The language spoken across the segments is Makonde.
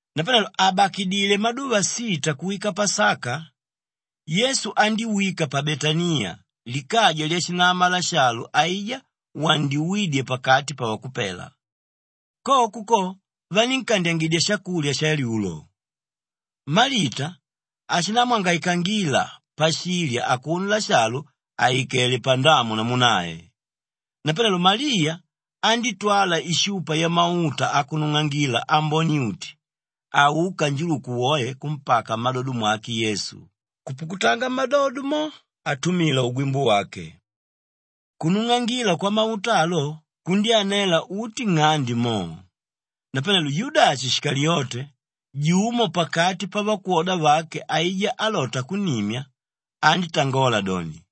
Napanelo àbakidile maduva sita kuwika Pasaka, Yesu andíwika pa Betaniya likaja lyashinama Lashalu aijá wandyuwídye pakati pavakupela. Koko ko vanínkandyangidya shakulya shalyulo; Malita ashindamwangaikangila pashilya akuno Lashalu àikele pandamu namu nae. Napanelo Maliya andítwala ishupa yamauta akunung'angila ambone-uti aúka njuluku woe kumpaka mmadodo mwake Yesu, kupukutanga mmadodo mo atumila ugwimbu wake. Kunung'angila kwamauta alo, kundyánela uti nng'ande mo. Napanelo Yudashi Shikaliyote, jumo pakati pavakwoda vake aijá álota kunnimya, andítangola doni,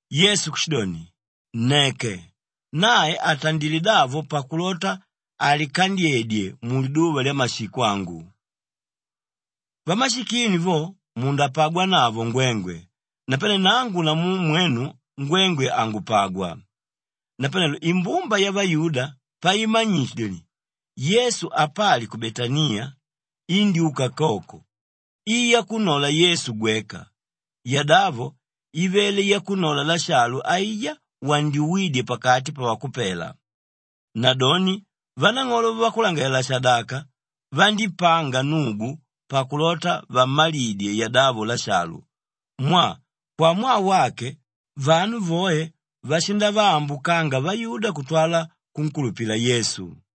Yesu kushidoni, “Nneke, nae atandilé davo pakulota alikandyedye muliduva lyamashiko angu. Vamashikini vo mundapagwanavo ngwengwe, napane nangu namu mwenu ngwengwe hangupagwa.” Napanelo imbumba yavayuda paimanyite doni, Yesu apali ku Betaniya, indyúka koko i yakunnola Yesu gweka, yadavo ivele yakunnola Lashalu aijá wandyuwídye pakati pavakupela. Nadoni vanang'olo vavakulangalalela-shadaka vandípanga nnugu pakulota vammalidye yadavo Lashalu mwaa, kwamwaa wake, vanu voe vashindavaambukanga vayuda kutwala kunkulupila Yesu.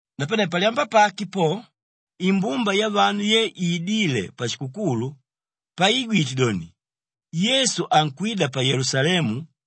Napane palyamba pake po, imbumba yavanu ye iidíle pashikukulu, paiigwite doni, Yesu ankwida pa Yelusalemu,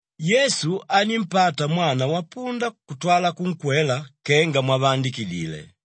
Yesu anímpata mwana wapunda kutwala kunkwela kenga mwavaandikidile,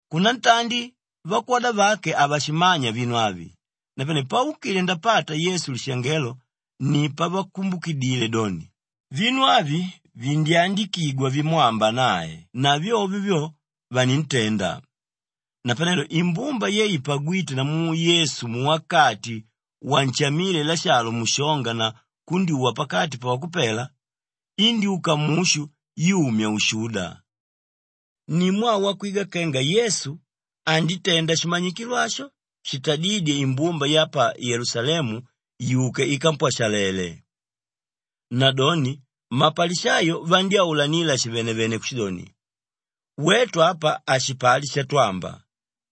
Kunantandi vakwoda vake havashimanya vinu avi, napane paukile ndapata Yesu lishangelo ni pavakumbukidile doni, vinu avi vindyandikigwa vimwamba nae na vyovyo vyo, vanintenda. Napanelo imbumba ye ipagwíte namu Yesu muwakati wanshamíle Lashalu mushonga na kundyuwa pakati pavakupela, indyúka mushu yumya ushuda. Ni mwaa wakwigwa kenga Yesu andítenda shimanyikilo asho shitadídye imbumba ya pa Yelusalemu yuke ikampwashalele. Nadoni mapalishayo vandyaulanila shivenevene kushidoni, “Wetu apa hashipali shatwamba!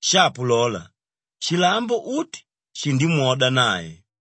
Shapo lola, shilambo uti shindimwoda nae!”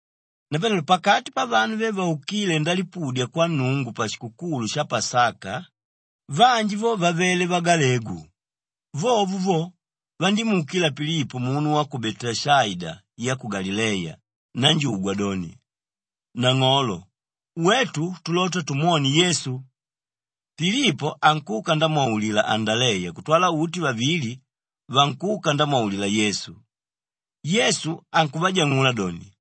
Napanelo pakati pavanu ve vaukíle ndalipudya kwa Nnungu pashikukulu sha Pasaka, vanji vo vavele vagalegu. Vovo vo, vandímuukila Pilipo munu wa ku Beteshaida ya ku Galileya nanjugwa doni, “Nang'olo, wetu tulota tumwone Yesu.” Pilipo ankuka ndamwaulila Andaleya kutwala uti vavili, vankuka ndamwaulila Yesu. Yesu ankuvajang'ula doni,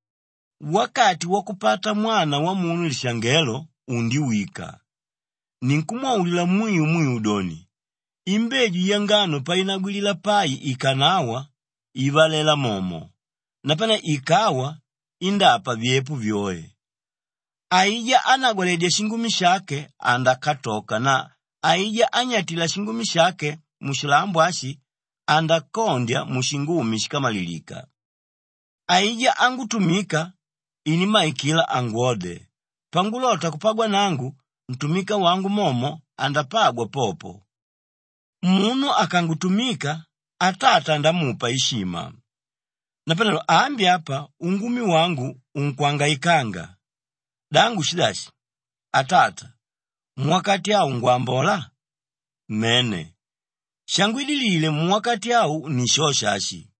“Wakati wakupata Mwana Wamunu lishangelo, undiwika. Ninkumwaulila mwiu mwiu doni, imbeju yangano painagwilila pai ikanawa, ivalela momo. Napane ikawa, indápa vyepo vyoe. Aijá ánagwaledya shingumi shake andakatoka na aijá ányatila shingumi shake mushilambo ashi, andakondya mushingumi shíkamalilika. Aijá ángutumika, inimmaikila angwode. Pangulota kupagwa nangu, ntumika wangu momo andapagwa popo. Munu akangutumika, Atata andamupa ishima. “Napanelo ambi apa ungumi wangu unkwangaikanga. Da ngushi dashi? ‘Atata, muwakati au ngwambola’? Mene, shangwidilile muwakati au ni shosho ashi.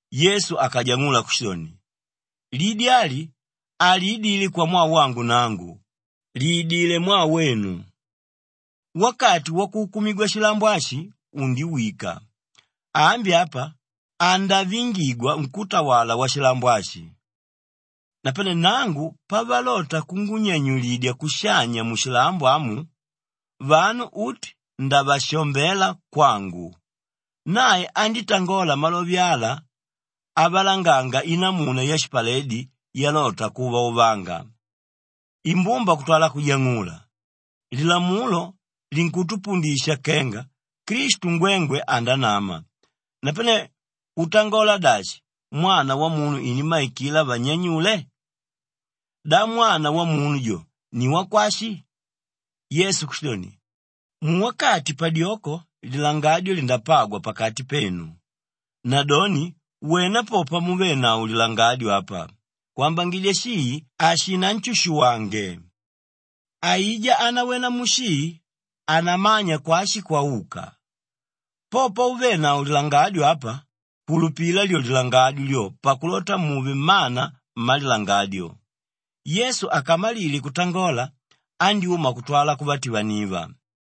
Yesu akajang'ula kushidoni, “Lidi ali haliidile kwamwaa wangu nangu, liidilé mwaa wenu. Wakati wakuukumigwa shilambo ashi undiwika. Ambi apa, andavingigwa nkútawala washilambo ashi. Napane nangu pavalota kungunyanyulidya kushanya mushilambo amu, vanu uti ndavashombela kwangu.” Nae andítangola malove ala avalanganga inamuna yashipaledi yalota kuvauvanga. Imbumba kutwala kujang'ula, “Lilamulo linkutupundisha kenga, ‘Klistu ngwengwe andanama,’ napane utangola dashi, ‘Mwana Wamunu inimmaikila vannyanyule’? Da ‘Mwana Wamunu jo’ ni wakwashi?” Yesu kushidoni, “Muwakati padyoko lilangadyo lindapagwa pakati penu. Nadoni wena po pamuvenavo lilangadyo apa kwambangidya shii hashinanshushuwange. Aijá ánawena mushii, hanamanya kwashi kwauka. Po pauvenavo lilangadyo apa, kulupila lyo lilangadyo lyo pakulota muve mmana mmalilangadyo.” Yesu akamalile kutangola, andyúma kutwala kuvativaniva.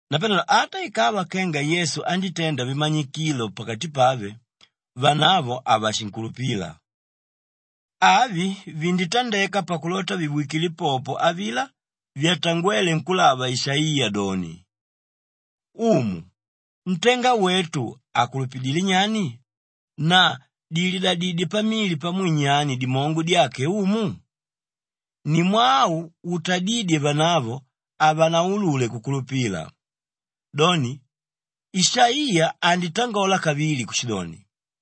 Napanelo ata ikava kenga Yesu anditenda vimanyikilo pakati pave, vanavo havashinkulupila. Avi vinditandeka pakulota viwikile popo avilá vyatangwéle nkúlava Ishaiya doni, “Umu, ntenga wetu akulupidilé nyani na dililadidyé pamili pamwe nyani dimongo dyake Umu?” Ni mwaa au utadídye vanavo havanaulule kukulupila. Doni, Ishaiya anditangola kavili kushidoni,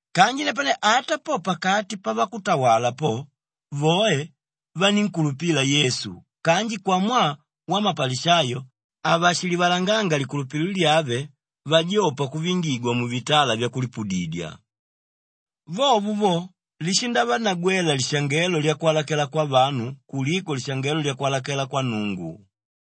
Kanji napane ata po pakati pavakutawala po, voe vanínkulupila Yesu kanji kwamwaa wamapalishayo havashilivalanganga likulupililo lyave vajopa kuvingigwa muvitala vyakulipudidya. Vovo vo, lishindavanagwela lishangelo lyakwalakela kwavanu kuliko lishangelo lyakwalakela kwa Nnungu.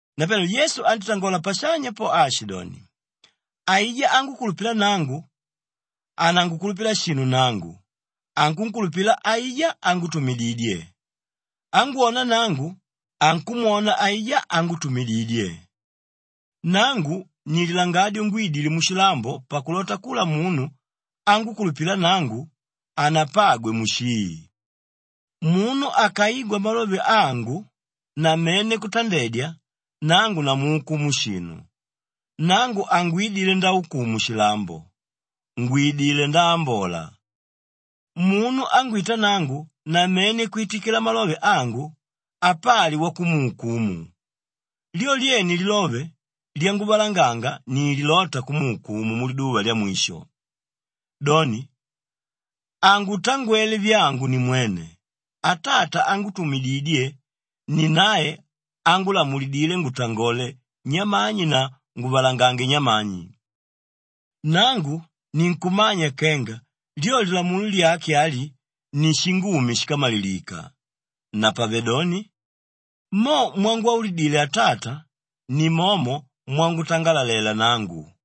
Napanelo Yesu andítangola pashanya po aashidoni, “Aijá ángukulupila nangu, hanangukulupila shinu nangu, ankunkulupila aijá ángutumididye. Ángwona nangu, ankumwona aijá ángutumididye. Nangu ni Lilangadyo ngwídile mushilambo pakulota kula munu ángukulupila nangu, hanapagwe mushii. Munu akaigwa malove angu na mene kutandedya, nangu namuukumu shinu. Nangu hangwidile ndaukumu shilambo, ngwidilé ndaambola. Munu ángwita nangu na mene kwitikila malove angu, apali wakumuukumu. Lyo lyene lilove lyanguvalanganga ni lilóta kumuukumu muliduva lyamwisho. Doni, hangutangwele vyangu nimwene; Atata ángutumididye ni nae ángulamulidile ngutangole nyamani na nguvalangange nyamani. Nangu ninkumanya kenga lyo lilamulo lyake ali ni shingumi shíkamalilika. Napavedoni, mo mwangwaulidile Atata, nimomo mwangutangalalela nangu.”